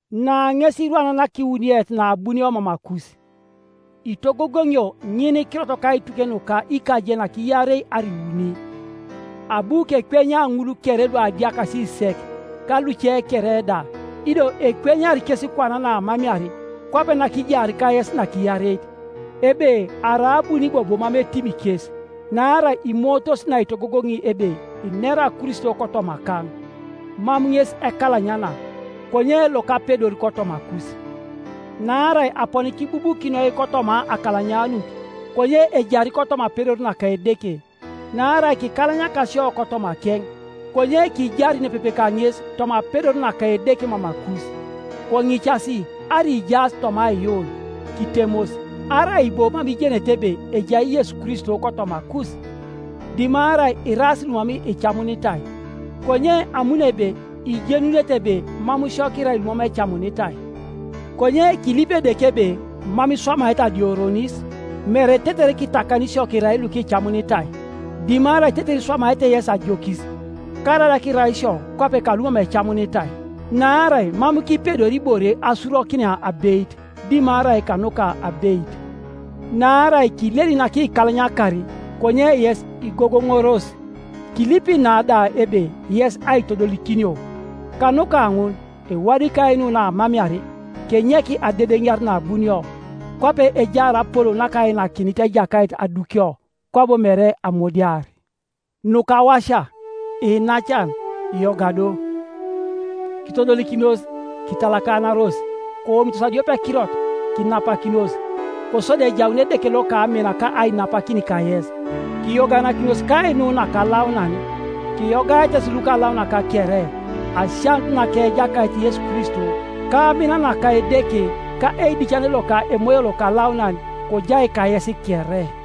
Na ŋes irwan nakiwuniet naabunio mamakus. Itogogoŋio ŋinikirot kaituke nuka ikajenak iarei arai iuni. Abu kekwenya ŋul kere luadiakasi sek, ka luce kere da, ido ekwenyari kes kwana naamamear, kwape nakijaar kayes nakiareit, ebe arai abuni bobo mam etimi kes, naarai imootos naitogogoŋi ebe inera Kristo kotomakaŋ. Mam ŋes ekalanyana, konye lokapedor kotomakus. Naarai aponi kibubukinoi kotoma akalanyanut, konye ejari kotoma apedor naka Edeke, Naarai kikalanyaka isio kotomakeŋ, konye kijari nepepe kaŋes toma apedor naka Edeke mamakus. Koŋicas arai ijaas toma aiyuun; kitemos. Arai bo mam ijenete ebe ejai Yesu Kristo kotomakus? Dimarai iraas lumam icamunitai. Konye amuno ebe ijenunete ebe mam sio kirai lumam ecamunitai. Konye kilipi Edeke ebe mam iswamaete adioronis, mere tetere kitakani isio kirai lukicamunitai, dimarai tetere iswamaete yesi ajokis, karaida kirai isio kwape kalumam ecamunitai. Naarai mam kipedori ibore asurokinia abeit, dimarai kanuka abeit, Naarai kileli nakikalanyakar, konye yes igogoŋoros. Kilipi na da ebe yes aitodolikinio. Kanuka ŋun ewadikai nu naamamear, kenyek adedeniar naabunio, kwape ejaar apolou nakainakinit Ejakait adukio, kwabo mere amudiar. Nukawasia, iinacan, yoga do. Kitodolikinos, kitalakanaros, koomitos adiopekirot, kinapakinos, kosodi ejaun Edeke loka amin ka ainapakin kayes. Kiyoganakinos kainu nakalaunan. Kiyogaete yes lukalaunak kere. Asianut naka Ejakait Yesu Kristo, ka amin naka Edeke, ka eidicane loka Emoyo Lokalaunan, kojai kayes kere.